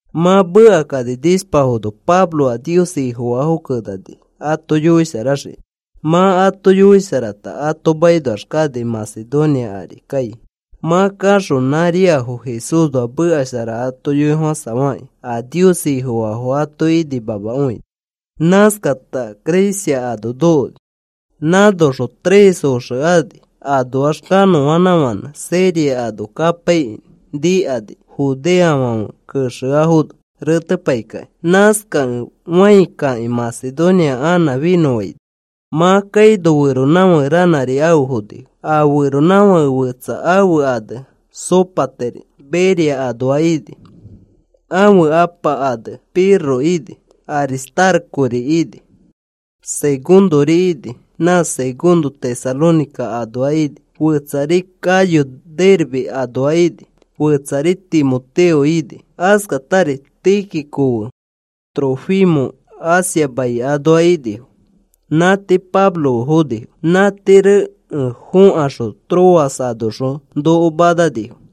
Mã mekakani nishpafono Pablo a Nios Ifofaafo kenani ato yoisharaxiki. Mã ato yoisharata, ato makinoax kani Macedonia ari kai. Mã kaxõ nãriafo Jesúsnoa meka shara ato yoifofãsafakĩ a Nios Ifofaafo ato inimamakõini. Nãskata Grecia ano nokoni. Nãnoxõ tres oxe ani anoax kanõanãfãnẽ Siria ano kapaikĩ, nikani judeofãfe kexeafono retepai kakĩ. Nãskakẽ fãi kakĩ, Macedonia anã finõfaini. Mã kaino feronãfake ranãri afe fonifo. A feronãfake fetsa ãfe ane Sópater Berea anoa ini. Ãfe apa ane Pirro ini, Aristarcori ini, Segundori ini, nã Segundo Tesalónica anoa ini. Fetsari Gayo, Derbe anoa ini. Fetsari Timoteo ini. Askatari Tíquico fe Trófimo Asia mai anoa inifo. Nã tii Pablo fe fonifo. Nã tii rekẽ fokaxõ Troas anoxõ noko mananifo.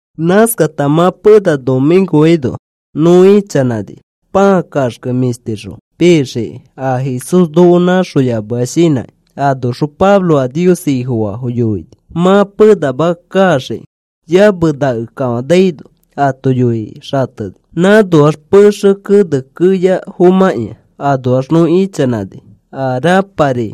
Nãskata mã pena nomĩkoaino nõ ichanãni pãa kaxke mĩshtixõ pixiki a Jesús noko nãxoyamea shinãkĩ. Anoxõ Pablo a Nios Ifofaafo yoini, mã penama kaxiki yamenake kafanaino ato yoikĩ xateni. Nãnoax pexe kene keya fomãkĩa anoax nõ ichanãni, a rãpari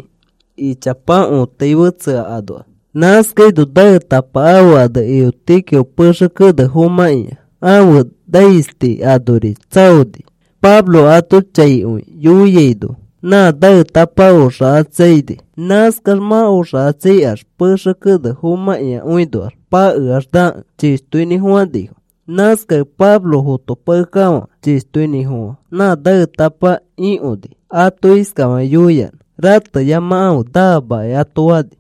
ichapa õtai fetsea anoax. Nãskaino naetapa ãfe ane Eutico pexe kene fomãkĩa ãfe naisti anori tsaoni. Pablo ato chaikõi yoiaino nã naetapa oxakatsaini. Nãskax mã oxachãi kaax pexe kene fomãkĩakõinoax pakeax nakẽ chishtoinĩfofãnifo. Nãskakẽ Pablo fotopakekafã chishtoinĩfofã nã naetapa ikõni, ato iskafakĩ yoiyanã: “Rateyamakãfe, naamaki,” ato fani.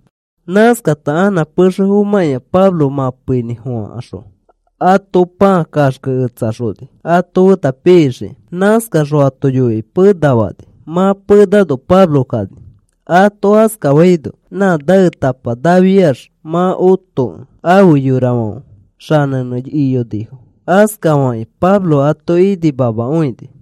Nãskafata anã pexe fomãkĩa Pablo mãpeinĩfofãxõ ato pãa kaxkeketsaxoni ato feta pixiki. Nãskaxõ ato yoikĩ pena fani. Mã penano Pablo kani. Ato askafaino nã naetapa nafiax mã otokẽ afe yorafãfe xanẽnẽ iyonifo. Askafakĩ Pablo ato inimamakõini.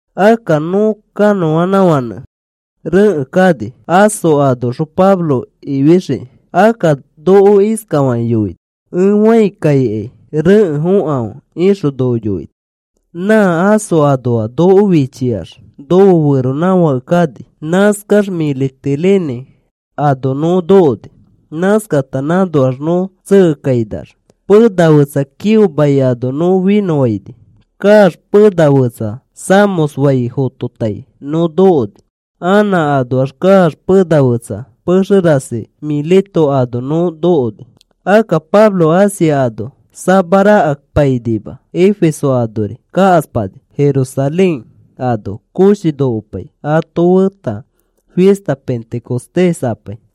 Akka nõ kanõanãfãnẽ rekẽ kani, Aso anoxõ Pablo ifixiki. Akka noko iskafakĩ yoini: “Ẽ fãi kaikai rekẽ fokãfe,” ixõ noko yoini. Nã Aso anoa noko fichiax nofe feronãfãke kani. Nãskax Mitilene ano nõ nokoni. Nãskata nãnoax nõ tsekekainax pena fetsa Quío mai nõ finõfaini kaax pena fetsa Samos fai fototai nõ nokoni. Anã anoax kaax pena fetsa pexe rasi Mileto ano nõ nokoni. Akka Pablo Asia ano samarakapainima. Efeso anori kakaspani, Jerusalén ano koshi nokopai ato feta fista Pentecostés apai.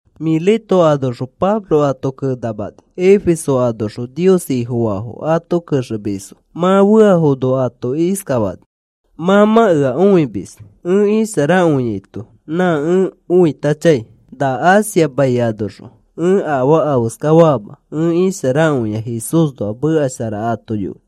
Mileto anoxõ Pablo ato kenamani, Efeso anoxõ Nios Ifofaafo ato kexemisfo. Mã feafono ato iskafani: “Mã mã ea õimis ẽ isharakõiaito nã ẽ oitachãi. Na Asia mai anoxõ ẽ afaa afeska fama ẽ isharakõia Jesúsnoa meka shara mato yoi.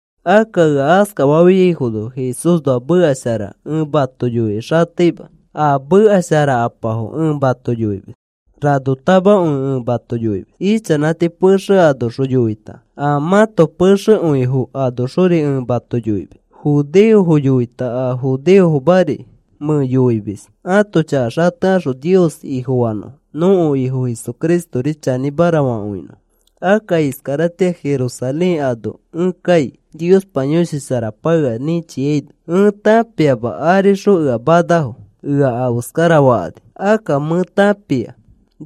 Akka ea askafafiaifono Jesúsnoa meka shara ẽ mato yoikĩ xateima. A meka sharakapafo ẽ mato yoimis. Ranotamakõi ẽ mato yoimis, ichanãti pexe anoxõ yoita a mãto pexekõifo anoxori ẽ mato yoimis. Judeofo yoita a judeofomari mẽ yoimis ãto chaka xatekaxõ Nios Ifofanõfo nõko Ifo Jesucristori chanĩmara fakõinõfo. “Akka iskaratĩa Jerusalén ano ẽ kai, Niospa Yõshi Sharapa ea nĩchiaino. Ẽ tãpiama arixõ ea manafo ea afeskarafakani. Akka mẽ tãpia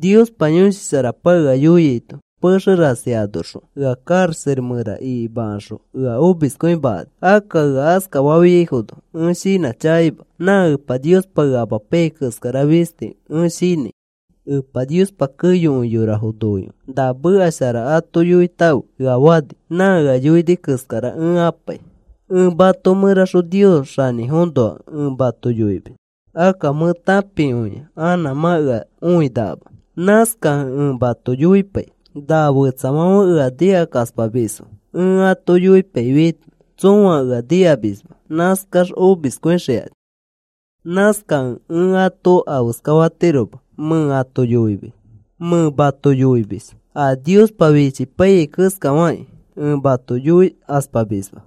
Niospa Yõshi Sharapa ea yoiaito, pexe rasi anoxõ ea karaxa mẽra ikimakaxõ ea omiskõimakani. Akka ea askafafiaifono ẽ shinãchakaima. Nã Epa Niospa ea amapaiyai keskara fisti ẽ shinãi. Epa Niospa keyokõi yorafo noikõi na meka shara ato yoitãfe ea fani. Nã ea yoini keskara ẽ apai. “Ẽ mato mẽraxõ Nios xanĩfoõnoa ẽ mato yoimis. Akka mẽ tãpikõia anã mã ea õinakama. Nãskakẽ ẽ mato yoipai. Na fetsafãfe ea nikakaspamisfo ẽ ato yoipaifiaito tsõa ea nikamisma. Nãskax omiskõixikani. Nãskakẽ ẽ ato afeskafatiroma, mẽ ato yoimis. Mẽ mato yoimis a Niospa fichipaiyai keskafakĩ ẽ mato yoikaspamisma.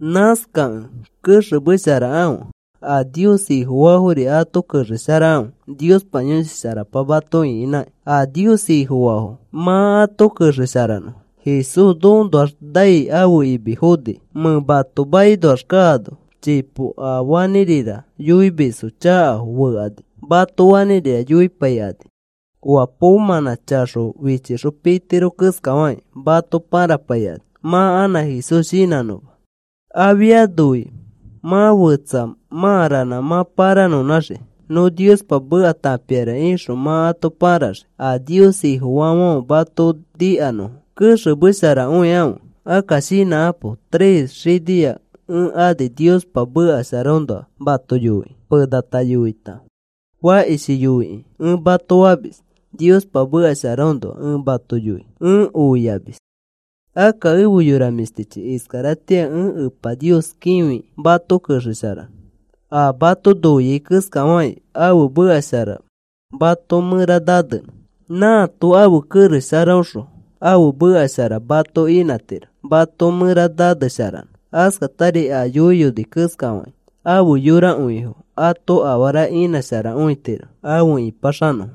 Nãskakẽ kexemesharakãfe, a Nios Ifofaafori ato kexesharakãfe. Niospa Yõshi Sharapa mato ĩkinãki, a Nios Ifofaafo mã ato kexesharanõ. Jesús nokoõnoax nai ãfe imi foniki. Mẽ mato makinoax kaano, chipo a fanĩrira yoimisfo chakafo fekani mato fanĩrira yoipaikani. Oa poomãnã chaxo fichixõ pitiro keskafakĩ mato pãrapaikani mã anã Jesús shinãnõma. Afianofi mã fetsa mã ranã mã pãranõnãxii nõ Niospa meka tãpiara ixõ mã ato pãraxii, a Nios Ifofaafãfe mato nikanõfo. Kexemesharakõikãfe, akka shinãkapo. Tres xinia ẽ ani Niospa meka sharaõnoa mato yoikĩ. Penata yoita, fakishi yoikĩ ẽ mato famis, Niospa meka sharaõnoa ẽ mato yoi ẽ oiamis. “Akka efe yora mĩshtichi, iskaratĩa ẽ Epa Nios kĩfi mato kexesharanõ, a mato noiai keskafakĩ ãfe meka shara mato mẽra nanenõ. Nãato ãfe kerex sharaõxõ ãfe meka shara mato inãtiro mato mẽra nanesharanõ askatari a yoiyoni keskafakĩ afe yorakõifo ato afara inãsharakõitiro afe ĩpaxanõfo.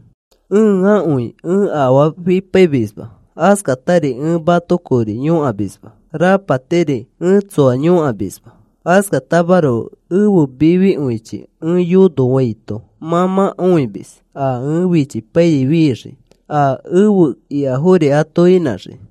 Ẽakõi ẽ afaa fipaimisma, askatari ẽ mato kori yõkamisma, rapatiri ẽ tsoa yõkamisma. Askatamaroko ẽfe mifikõichi ẽ yonofaito mã mã õimis, a ẽ fichipaiyai fixiki, a efe ikafori ato inãxiki.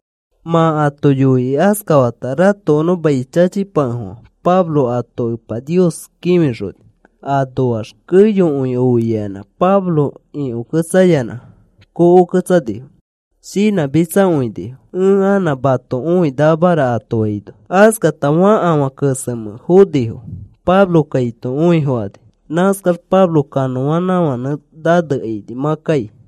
Mã ato yoikĩ askafata ratokonõ mai chachipakefofã Pablo ato Epa Nios kĩfixoni. Anoax keyokõi oiayanã Pablo ikõketsayanã kokoketsanifo. Shinãmitsakõinifo: “Ẽ anã mato õinakamara,” ato faino, askakãta afe fakafã kesemẽ fonifo Pablo kaito õifokani. Nãskax Pablo kanõanãfãnẽ nanekaini mã kai.